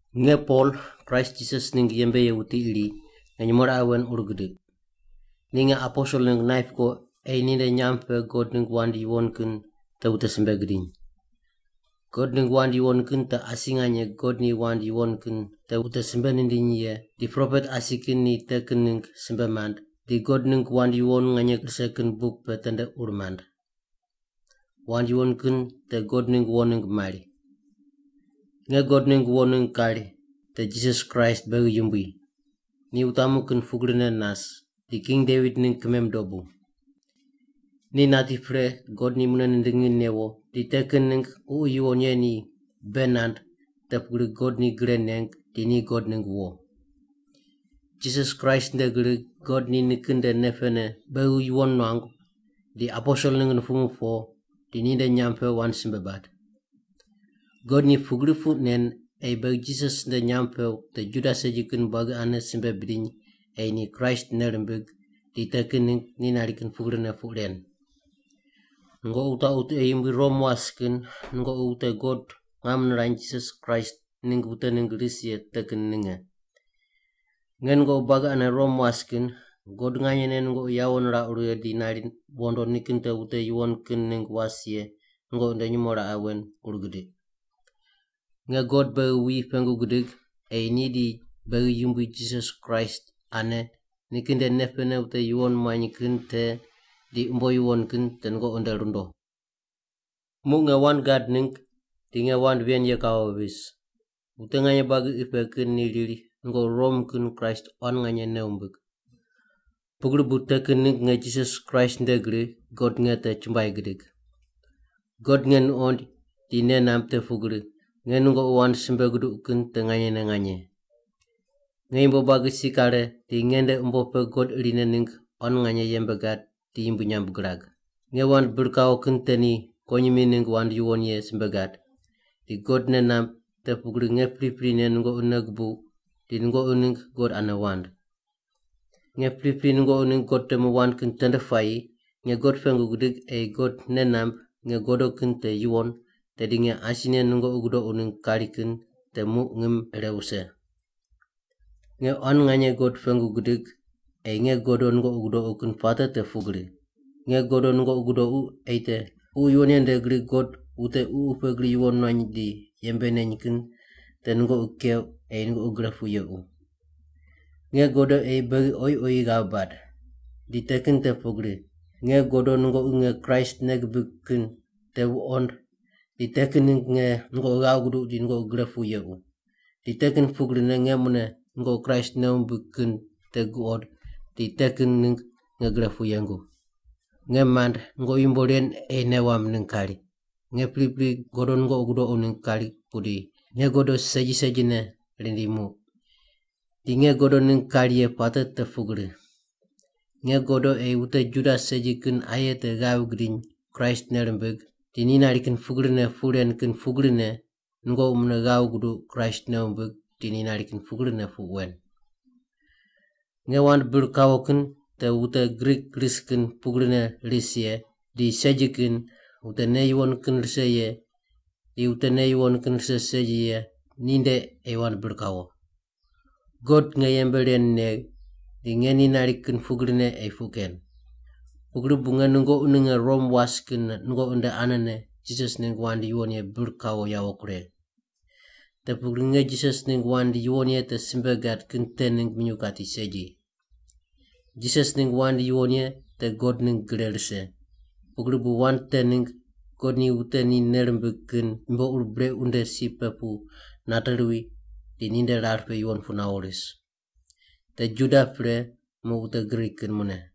Nge Pol, Kraist Jisas ningg yembe ye wuti iri, nge nyumo raqe wen ur gidiq. Ni nge aposel ningg naip ko ei ni nde nyamb pe God ningg wand yuwon kin te wute simbe gidiny. God ningg wand yuwon kin te asi nganye God ni wand yuwon kin te wute simbe nindiny ye di propet asi kin ni te kin ningg simbe mand, di God ningg wand yuwon nganye rise kin buk pe tende ur mand. Wand yuwon kin te God ningg wo ningg mari. Nge God ningg wo ningg kari, te Jisas Kraist beghi Yumbui. Ni wutamu kin pugrine nas, di King Devit ningg kimem dobu. Ni nati pre God ni mune nindingi newo di te kin ningg Ququ Yuwon Ye ni bei nand te pugri God ni gre neng di ni God ningg wo. Jisas Kraist nde gri God ni nikin nde nei pene beghi yuwon nuangu di aposel ningg nupumu po di ninde nyamb pe wand simbe bad. God ni pugri puq nen ei beghi Jisas nde nyamb pe wute Juda segi kin buagi ane simbe bidiny ei ni Kraist nei rimbig di te ningg ni nari kin pugrine puq ren. Nungoqi wutaqu tiqe yumbui Rom was kin nungoqi wute God ngam nirany Jisas Kraist ningg wute ningg ris ye te kin ninge. Nge nungoqi buagi ane Rom was kin, God nganyene nungoqi yawo nirauq righe di nari wondo nikin te wute yuwon kin ningg was ye nungoqi nde nyumo raqe wen ur gidiq. Nge God beghi wuyi pengu gidig ei ni di beghi Yumbui Jisas Kraist ane nikin nde nei pene wute yuwon muany kin te di umbo yuwon kin te nungoqi nde rundo. Muq nge wand gad ningg di nge wand ven ye kawo vis, wute nganye buagi qi pe kin ni riri nungoqi Rom kin Kraist quan nganye nei wumbig. Pugri bu te kin ningg nge Jisas Kraist nde gri God nge te chumbuai gidig. God nge nuqoind di nei namb te pugri, nge nungoqi wand simbe guduq kin te nganyene nganye. Nge yumbo buagi si kare di nge nde umbo pe God irine ningg quan nganye yembe gad di yumbui nyamb girag. Nge wand bir kawo kin te ni kuwonyimi ningg wand yuwon ye simbe gad, di God nei namb te pugri nge priprine nungoqi nei gubuq di nungoqi ningg God ane wand. Nge pripri nungoqi ningg God temu wand kin tende puayi nge God pengu gidig ei God nei namb nge godo kin te yuwon tedi nge asine nungoqi gudoqu ningg kari kin te muq ngim ire wuse. Nge quan nganye God pengu gidig ei nge godo nungoqi gudoqu kin puate te pugri: nge godo nungoqi gudoqu ei te Ququ Yuwon Ye nde gri God wute ququ pe gri yuwon nuany di yembe neny kin te nungoqi keuq ei nungoqi gre pu yequ. Nge godo ei beghi oyi oyi ghav bad. Di te kin te pugri: Nge godo nungoqi nge Kraist nei gibig kin te wuqond di te kin ningg nge nungoqi ghav guduq di nungoqi gre pu yequ. Di te kin pugrine nge mune nungoqi Kraist nei wumbig kin te guqod di te kin ningg nge gre pu yengu. Nge mand nungoqi yumbo ren ei nei wamb ningg kari, nge pripri godo nungoqi gudoqu ningg kari pudi nge godo segi segine rindi muq. Di nge godo ningg kari ye puate te pugri: nge godo ei wute Juda segi kin aye te ghav gidiny Kraist nei rimbig di ni nari kin pugrine puq ren kin pugrine nungoqi mune ghav guduq Kraist nei wumbig di ni nari kin pugrine puq wen. Nge wand bir kawo kin te wute Grik ris kin pugrine ris ye, di segi kin, wute nei yuwon kin rise ye di wute nei yuwon kin rise segi ye ninde ei wand bir kawo. God nge yembe ren negh di nge ni nari kin pugrine ei puq ken. Pugri bu nge nungoqi ninge Rom was kin nungoqi nde anene Jisas ningg wand yuwon ye bir kawo yawo kuregh. Te pugri nge Jisas ningg wand yuwon ye te simbe gad kin te ningg minyuw kati segi. Jisas ningg wand yuwon ye te God ningg gre rise, pugri bu wand te ningg God ni wute ni nei rimbig kin yumbo ur brequ nde si pe pu nate ruwi di ninde rar pe yuwon pu nawo ris. Te Juda pre muq wute Grik kin mune.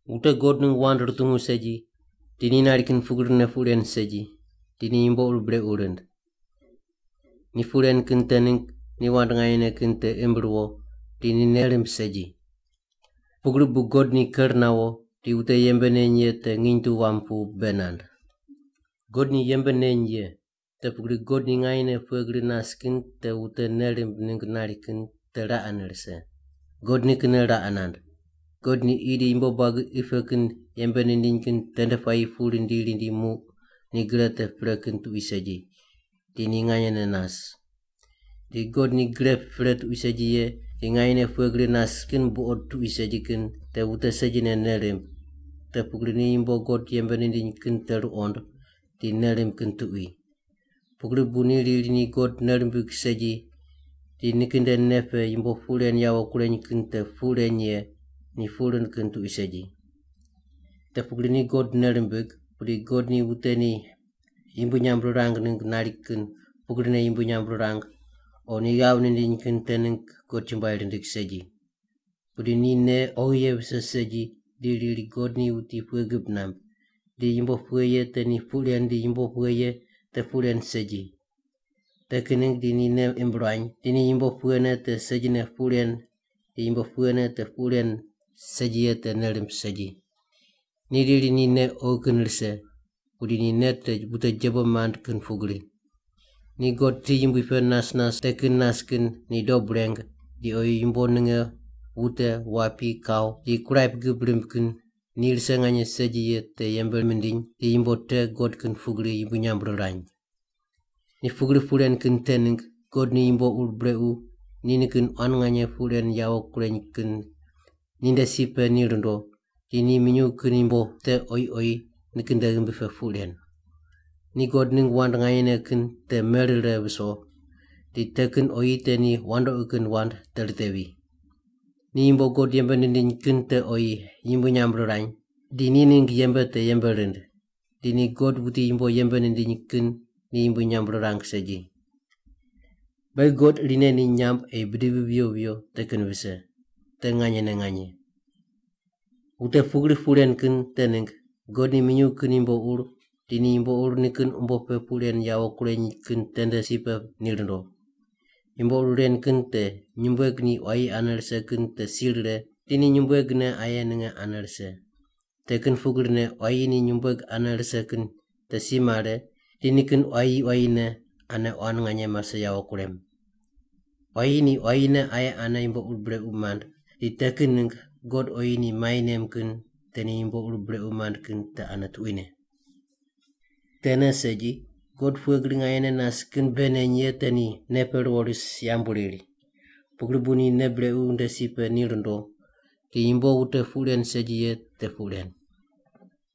Wute God ningg wand rutungu segi, di ni nari kin pugrine puq ren segi, di ni yumbo ur brequ rind. Ni puq ren kin te ningg ni wand nganyene kin te imb ruwo di ni nei rimb segi. Pugri bu God ni ker nawo di wute yembe neny ye te nginy tu wam pu bei nand. God ni yembe neny ye, te pugri God ni nganyene pughe gri nas kin te wute nei rimb ningg nari kin te raqene rise. God nikinne raqe nand. God ni qi di yumbo buagi qi pe kin yembe nindiny kin tende puayi pu rindi rindi muq ni gre te pre kin tuqui segi di ni nganyene nas. Di God ni gre pre tuqui segi ye di nganyene pughe gri nas kin buqod tuqui segi kin te wute segine nei rimb, te pugri ni yumbo God yembe nindiny kin te ruqond di nei rimb kin tuqui. Pugri bu ni riri ni God nei rimbig segi di nikin nde nei pe yumbo puq ren yawo kureny kin te puq reny ye, ni puq rind kin tuqui segi. Te pugri ni God nei rimbig, pudi God ni wute ni yumbui nyamb rirang ningg nari kin pugrine yumbui nyamb rirang o ni ghav nindiny kin te ningg God chumbuai rindig segi. Pudi ni nei oghi ye vise segi di riri God ni wuti pughe gib namb, di yumbo pughe ye te ni puq ren di yumbo pughe ye te puq ren segi. Te kin ningg di ni nei imb ruany di ni yumbo pughene te segine puq ren di yumbo pughene te puq ren segi ye te nei rimb segi. Ni riri ni nei oghi kin rise, pudi ni nei te wute jebo mand kin pugri. Ni God ti yumbui pe nas nas te kin nas kin ni dob reng di oyi yumbo ninge wute, wapi, kau, di kuraip gib rimb kin ni rise nganye segi ye te yembe mindiny di yumbo te God kin pugri yumbui nyamb rirany. Ni pugri puq ren kin te ningg God ni yumbo ur brequ ni nikin quan nganye puq ren yawo kureny kin ninde si pe ni rundo di ni minyuw kin yumbo te oyi oyi nikin nde ghimbi pe puq ren. Ni God ningg wand nganyene kin te merire viso, di te kin oyi te ni wandoqi kin wand te ritevi. Ni yumbo God yembe nindiny kin te oyi yumbui nyamb rirany di ni ningg yembe te yembe rind, di ni God wuti yumbo yembe nindiny kin ni yumbui nyamb rirang segi. Beghi God irine ni nyamb ei bidivi viyo viyo te kin vise. Te nganyene nganye. Wute pugri puq ren kin te ningg God ni minyuw kin yumbo ur di ni yumbo ur nikin umbo pe puq ren yawo kureny kin tende si pe ni rundo. Yumbo ur ren kin te nyumbueg ni quayi ane rise kin te si rire di ni nyumbuegne aye ninge ane rise. Te kin pugrine quayi ni nyumbueg ane rise kin te si mare di nikin quayi quayine ane quan nganye mase yawo kurem. Quayi ni quayine aye ane yumbo ur brequ mand, di te kin ningg God oyi ni mai nem kin te ni yumbo ur brequ mand kin te ane tuquine. Tene segi, God pughe gri nganyene nas kin bei neny ye te ni nei pe ruwo ris yambu riri, pugri bu ni nei brequ nde si pe ni rundo di yumbo wute puq ren segi ye te puq ren.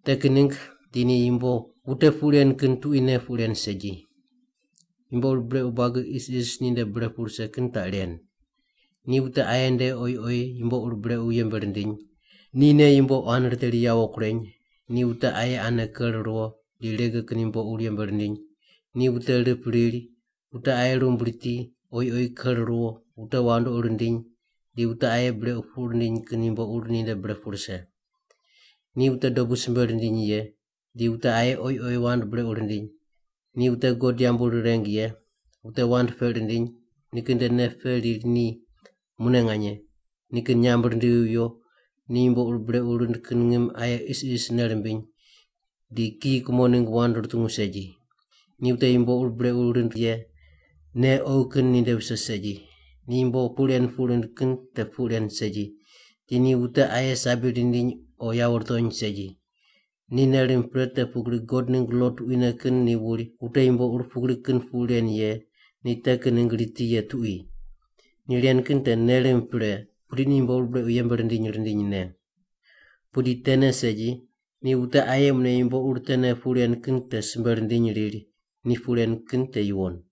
Te kin ningg di ni yumbo wute puq ren kin tuquine puq ren segi. Yumbo ur brequ buagi isis ninde bre pu rise kin taq ren: ni wute aye nde oyi oyi yumbo ur brequ yembe rindiny, nine yumbo quan riteri yawo kureny, di wute aye ane ker ruwo di rege kin yumbo ur yembe rindiny. Ni wute rip riri, wute aye rumb riti, oyi oyi ker ruwo, wute wandoqi rindiny, di wute aye brequ puq rindiny kin yumbo ur ninde bre pu rise. Ni wute dobu simbe rindiny ye, di wute aye oyi oyi wand brequ rindiny, ni wute God yambu rireng ye, wute wand peq rindiny, nikin nde nei pe riri ni mune nganye, nikin nyamb rindivi viyo, ni yumbo ur brequ rind kin ngim aye isis nei rimbiny, di kiyi kumo ningg wand rutungu segi. Ni wute yumbo ur brequ rind ye, nei oghi kin ninde vise segi; ni yumbo puq ren puq rind kin te puq ren segi; di ni wute aye sabi rindiny o yawo rutony segi. Ni nei rimb pre te pugri God ningg lo tuquine kin ni wuri wute yumbo ur pugri kin puq ren ye ni te kin ningg riti ye tuqui. Ni ren kin te nei rimb pre, pudi ni yumbo ur brequ yembe rindiny rindinyne. Pudi tene segi, ni wute aye mune yumbo ur tene puq ren kin te simbe rindiny riri ni puq ren kin te yuwon.